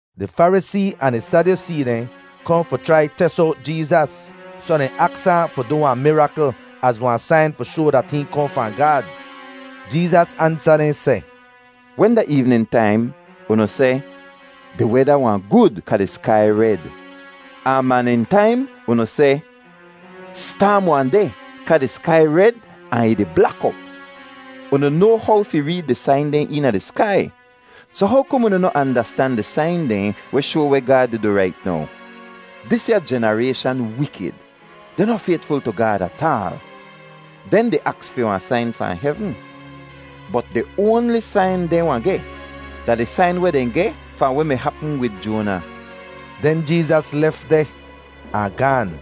Di Farisee ahn di Sadyusee dehn kohn fi chrai tes owt Jeezas, soh dehn aks ahn fi du wahn mirakl az wahn sain fi shoa dat hihn kohn fahn Gaad. Jeezas ansa dehn seh, “Wen da eevnin taim unu seh, ‘Di weda wahn gud kaa di skai red.’ Ahn maanin taim unu seh, ‘Staam wahn deh kaa di skai red ahn ih di blak op.’ Unu noa how fi reed di sain dehn eena di skai, soh how kom unu noh andastan di sain dehn weh shoa weh Gaad di du rait now? Disya jenarayshan wikid; dehn noh faytful tu Gaad ataal. Dehn di aks fi wahn sain fahn hevn, bot di oanli sain dehn wahn geh da di sain weh dehn geh fahn weh mi hapm wid Joana.” Den Jeezas lef deh ahn gaan.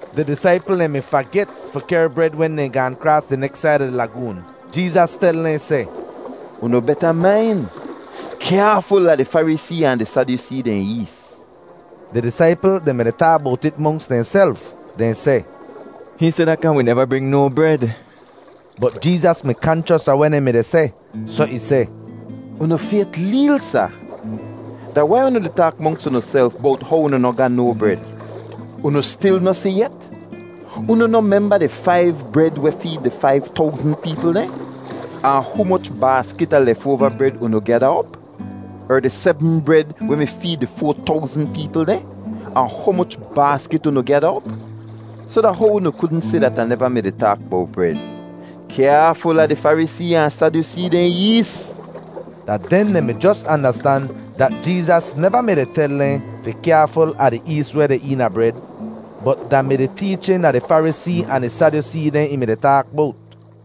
Di disaipl dehn mi faget fi kehr bred wen dehn gaahn kraas di neks said a di lagoon. Jeezas tel dehn seh, “Unu beta main; kyaaful a di Farisee ahn di Sadyusee dehn ees.” Di disaipl dehn mi-di taak bowt it monks dehnself. Dehn seh, “Hihn seh dat kaa wi neva bring no bred.” Bot Jeezas mi kanchos a weh dehn mi-di seh, soh ih seh, “Unu fayt leel, sa. Da wai unu di taak monks unuself bowt how unu noh ga no bred? Unu stil noh si yet? Unu noh memba di faiv bred weh feed di faiv towzn peepl dehn, ahn humoch baaskit a lefoava bred unu gyada op? Er di sebm bred weh mi feed di foa towzn peepl dehn, ahn humoch baaskit unu gyada op? Soh da how unu kudn si dat Ah neva mi-di taak bowt bred? Kyaaful a di Farisee ahn Sadyusee dehn ees.” Da den dehn mi jos andastan dat Jeezas neva mi-di tel dehn fi kyaaful a di ees weh deh eena bred, bot da mi di teechin a di Farisee ahn di Sadyusee dehn ih mi-di taak bowt.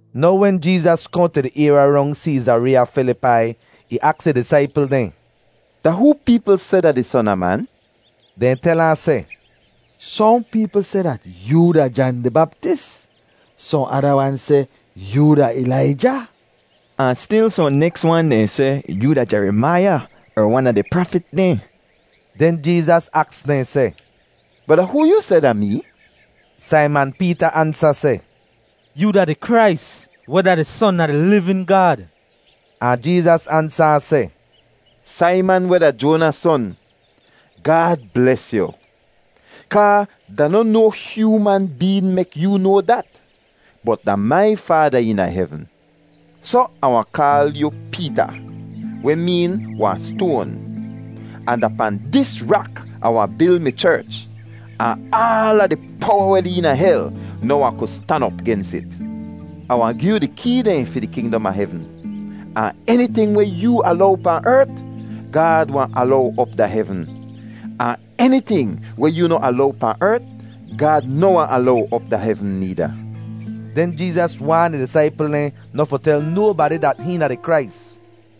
Now wen Jeezas kohn tu di ayrya rong Seezareeya Filipai, ih aks ih disaipl dehn, “Da hoo peepl seh da di Son a Man?” Dehn tel ahn seh, “Sohn peepl seh dat yoo da Jan di Baptis; sohn ada wan seh yoo da Ilaija; ahn stil sohn neks wan dehn seh yoo da Jerimaiya er wan a di prafit dehn.” Den Jeezas aks dehn seh, “Bot da hoo yoo seh da mee?” Saiman Peeta ansa seh, “Yoo da di Krais weh da di Son a di livin Gaad.” Ahn Jeezas ansa ahn seh, “Saiman, weh da Joana son, Gaad bles yu! Kaa da noh no hyooman been mek yoo noa dat, bot da mai Faada eena hevn. Soh Ah wahn kaal yu ‘Peeta,’ weh meen ‘wahn stoan,’ ahn da pahn dis rak Ah wahn bil mi cherch, ahn aala di powa weh deh eena hel noh wahn ku stan op gens it. Ah wahn gi yu di kee dehn fi di kingdom a hevn, ahn eniting weh yoo alow pahn ert, Gaad wahn alow op da hevn, ahn eniting weh yoo noh alow pahn ert, Gaad noh wahn alow op da hevn needa.” Den Jeezas waan ih disaipl dehn noh fi tel nobadi dat hihn da di Krais.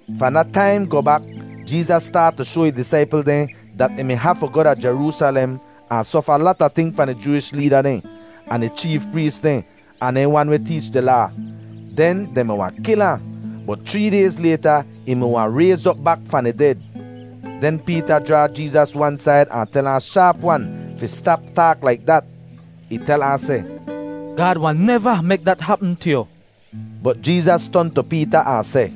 Fahn da taim goh bak, Jeezas staat tu shoa ih disaipl dehn dat ih mi hafu goh da Jeroosalem ahn sofa lata ting fahn di Jooish leeda dehn, ahn di cheef prees dehn, ahn dehn wan weh teech di Laa. Den dehn mi wahn kil ahn, bot chree dayz layta ih mi wahn rayz op bak fahn di ded. Den Peeta jraa Jeezas wan said ahn tel ahn shaap-wan fi stap taak laik dat. Ih tel ahn seh, “Gaad wahn neva mek dat hapm tu yu.” Bot Jeezas ton tu Peeta ahn seh,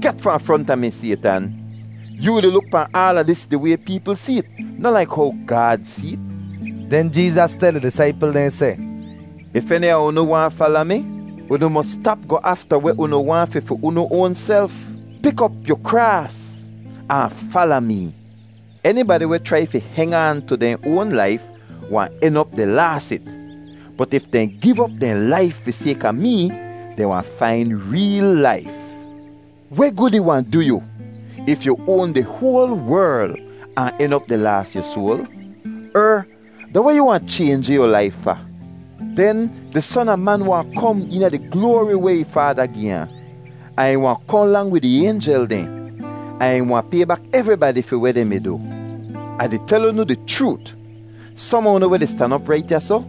“Get fahn fronta mi, Saytan! Yoo di luk pahn aala dis di way peepl see't, noh laik how Gaad see't.” Den Jeezas tel ih disaipl dehn seh, “If eni a unu waahn fala mi, unu mos stap goh afta weh unu waahn fi fi unu oanself. Pik op yu kraas ahn fala mee. Enibadi weh chrai fi heng aan tu dehn oan laif wahn en op di laas it. Bot if dehn giv op dehn laif fi sayka mee, dehn wahn fain reel laif. Weh gud ih wahn du yu if yu oan di hoal werl ahn en op di laas yu soal? Er, da weh yu wahn chaynji yu laif fa? Den di Son a Man wahn kom eena di gloari weh ih Faada gi ahn, ahn ih wahn kohn lang wid ih aynjel dehn, ahn ih wahn pay bak evribadi fi weh dehn mi du. Ah di tel unu di chroot, som a unu weh di stan op rait ya soh,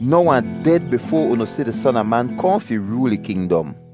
noh wahn ded bifoa unu si di Son a Man kohn fi rool ih kingdom.”